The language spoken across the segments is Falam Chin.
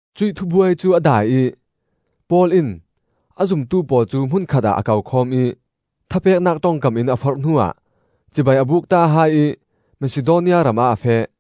Cuih thubuai cu a dai ih Paul in a zumtu pawl cu hmun khatah a kokhawm ih thapeknak ṭongkam in a forh hnuah cibai a bukta hai ih Masidonia ramah a feh.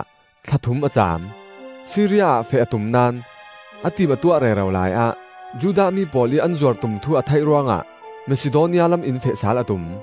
cutawkah thla thum a caam. Siria ah feh a tum naón, a tim a tuah rero laiah Judah mi pawl ih an zuar tum thu a theih ruangah Masidonia lam in feh sal a tum.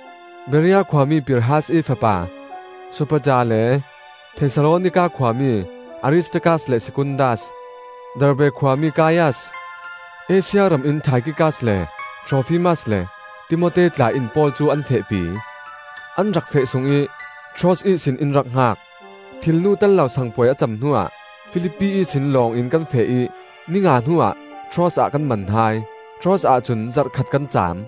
Berea khuami Pirhas ih fapa Sopater le Thesalonika khuami Aristarkas le Sekundas, Derbe khuami Kaias, Asia ram in Taikhikas le Trofimas, le Timote tla in Paul cu an fehpi. An rak feh sungih Troas ihsin in rak hngak. Thilnu tello Sang Puai a cem hnuah Filipi ihsin lawng in kan feh ih ni nga hnuah Troas ah kan man hai. Troas ahcun zarh khat kan caam.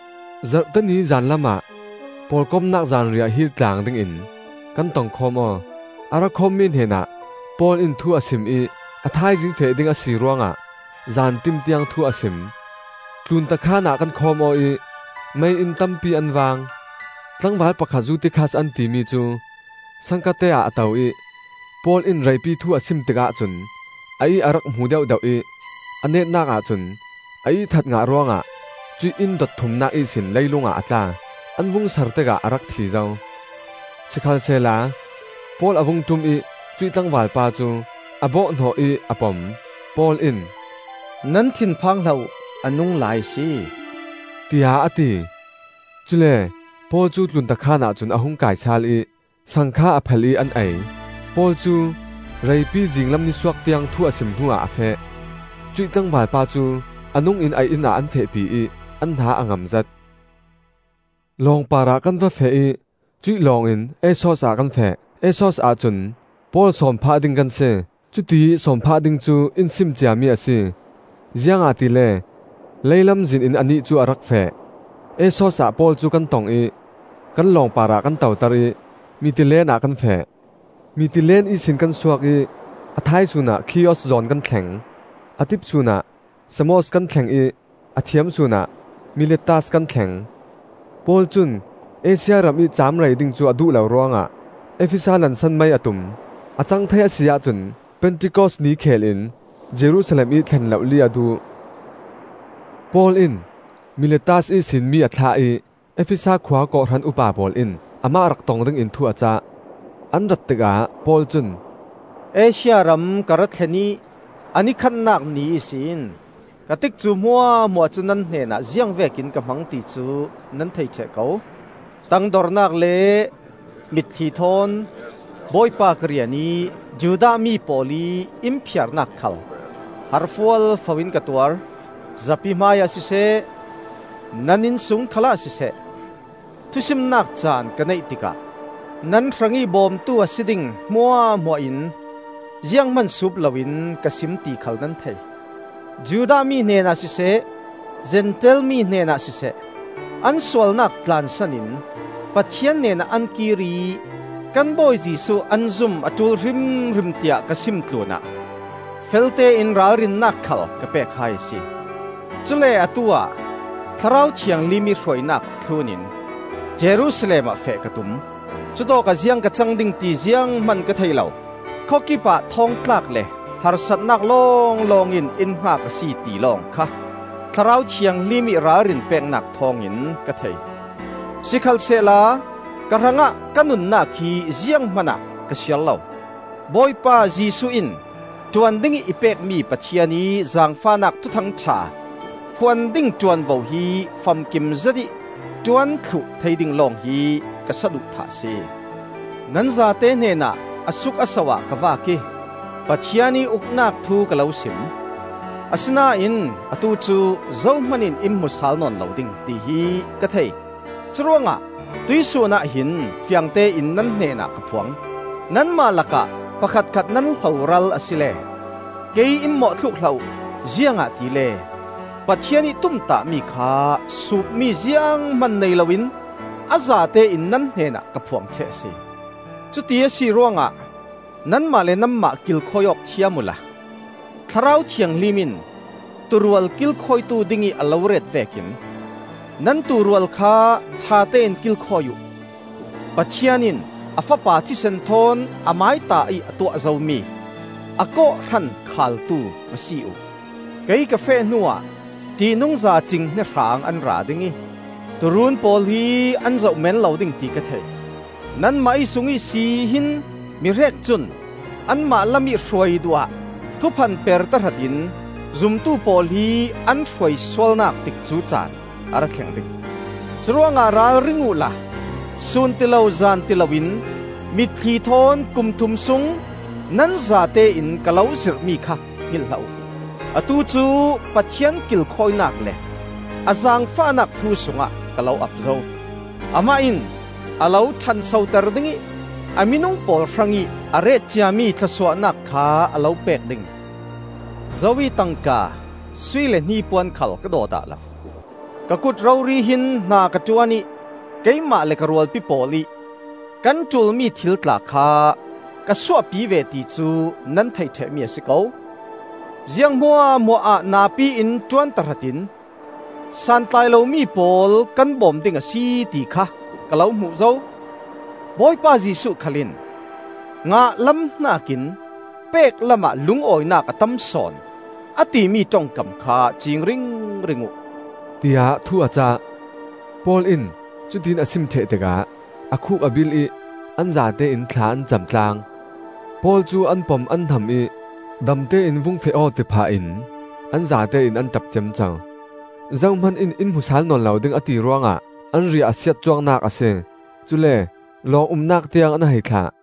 Zarhte ni zanlam ah pawlkomnak zanriah hil tlang dingin kan tongkhawm aw. A ra khawmmi hnenah Paul in thu a sim ih a thaizing feh ding a si ruangah zanṭim tiang thu a sim. Tlunta khaan ah kan khawm aw ih mei-inn tampi an vang. Tlangval pakhat Zutikhas an timi cu saangkate ah a to ih Paul in reipi thu a sim tikah cun a ih a rak hmu deuhdeuh ih a netnak ahcun a ihthat ngah ruangah cuih inn dot thumnak ihsin leilung ah a tla. An vung sar tikah a rak thi zo. Sikhalsehla Paul a vung ṭum ih cuih tlangvalpa cu a bawhhnawh ih a pom. Paul in, “Nan thinphang hlah uh, a nunglai a si,” tiah a ti. Cule Paul cu tlunta khaanah cun a hung kai sal ih sang kha a phel ih an ei. Paul cu reipi, zinglam nisuak tiang thu a sim hnuah a feh. Cuih tlangvalpa cu a nungin a inn ah an fehpi ih an hna a ngam zet. Lawng parah kan va feh ih cuih lawng in Assos ah kan feh; Assos ahcun Paul sawm phah ding kan si. Cutiih sawm phah ding cu in sim ciami a si, ziangahtile lei lamzin in anih cu a rak feh. Assos ah Paul cu kan tong ih kan lawng parah kan toter ih Mitilene ah kan feh. Mitilene ihsin kan suak ih a thaisun ah Khios zawn kan thleng. A tipsun ah Samos kan thleng ih a thiamsun ah Miletas kan thleng. Paul cun Asia ramih caam rei ding cu a duh lo ruangah Efesa lansan mai a tum. A cang thei a si ahcun Pentikos ni kheel in Jerusalem ih thlen lohli a duh. Paul in Miletas ihsin mi a thlah ih Efesa khua kawhhran upa pawl in amah rak tong dingin thu a cah. An rat tikah Paul cun, “Asia ram ka ra thlen ih a ni khatnak ni ihsin ka tikcu hmuahhmuah cu nan hnenah ziangvekin ka hmang ti cu nan thei ṭheh ko. Tangdornak le mitthli thawn Bawipa ka rian ih Judah mi pawl ih in phiarnak khal har fualfo-in ka tuar. Zapi hmaiah siseh, nan innsung khalah siseh, thusimnak caan ka neih tikah nan hrangih bawmtu a si ding hmuahhmuah in zianghman suup loin ka sim ti khal nan thei. Judah mi hnenah siseh, Zentail mi hnenah siseh, an sualnak tlansan in Pathian hnenah an kir ih kan Bawi Jesuh an zum a ṭul hrimhrim tiah ka sim tlunah feltein ralrinnak khal ka pek hai a si. Cule atu-ah Thlarau Thianghlim ih hruainak thlunin Jerusalem ah feh ka tum; cutawkah ziang ka cang ding ti zianghman ka thei lo. Khawkip ah thawngtlak le harsatnak lawnglawng in in hngak a si ti lawng kha Thlarau Thianghlim ih ralrin peknak thawngin ka thei. Sikhalsehla ka hrangah ka nunnak hi zianghman ah ka siar lo; Bawipa Jesuh in ṭuan dingih i pekmi Pathian ih zaangfahnak Thuthang ṭha phuan ding ṭuanvo hi famkim zetih ṭuan thluh thei ding lawng hi ka saduhthah a si. Nan zate hnenah a suk a so ah ka vak ih, Pathian ih Uknak thu ka lo sim. Asinain atu cu zohman in in hmu sal nawn lo ding, tihi ka thei. Curuangah tuihsun ah hin fiangtein nan hnenah ka phuang: nanmah lakah pakhatkhat nan hloral asile kei in mawhthluk hlah uh. Ziangahtile Pathian ih tumtahmi kha suupmi zianghman nei loin a zatein nan hnenah ka phuang ṭheh a si. Cuti a si ruangah nanmah le nanmah kilkhawi awk thiam uhla Thlarau Thianghlim in tuurual kilkhawitu dingih a lo ret vekin nan tuurual kha ṭhatein kilkhawi uh. Pathian in a Fapa thisen thawn Amaió ta ih a tuah zomi a kawhhran khaaltu va si uh! Kei ka feh hnuah ṭihnungza cinghnia hraang an ra ding ih tuuruun pawl hi an zoh meen lo ding, ti ka thei. Nanmah ih sung ihsi hin mihrek cun anmah lamih hruai duh ah thuphanper tahratin zumtu pawl hi an hruaisualnak tikcu caan a ra thleng ding. Curuangah ralring uhla sun tilo zan tilo in mitthli thawn kum thum sung nan zatein ka lo zirhmi kha hngilh hlah uh. Atu cu Pathian kilkhawinak le a zaangfahnak thu sungah ka lo ap zo. Amah in a lo ṭhansoter ding ih a minung pawl hrangih a ret ciami thlawsuahnak kha a lo pek ding. Zo ih tangka, sui le hnipuan khal ka daw dah lo. Ka kut rori hin hna ka ṭuan ih keimah le ka rualpi pawl ih kan ṭulmi thil tla kha ka suahpi ve ti cu nan thei ṭhehmi a si ko. Ziang hmuahhmuah ah napi in ṭuan tahratin santlai lomi pawl kan bawm ding a si ti kha ka lo hmuh zo; Bawipa Jesuh khal in, ‘Ngah lam hnakin pek lamah lungawinak a tam sawn,’ a timi ṭongkam kha ciing ringring uh,” tiah thu a cah. Paul in cutiin a sim ṭheh tikah a khuk a bil ih an zatein thla an cam tlang. Paul cu an pom an hnam ih damte in vung feh aw, ti phahin an zatein an ṭap ciamco. Zohman in in hmu sal nawn lo ding, a ti ruangah an riah a siat cuangnak a si. Cule lawng umnak tiang an hei thlah.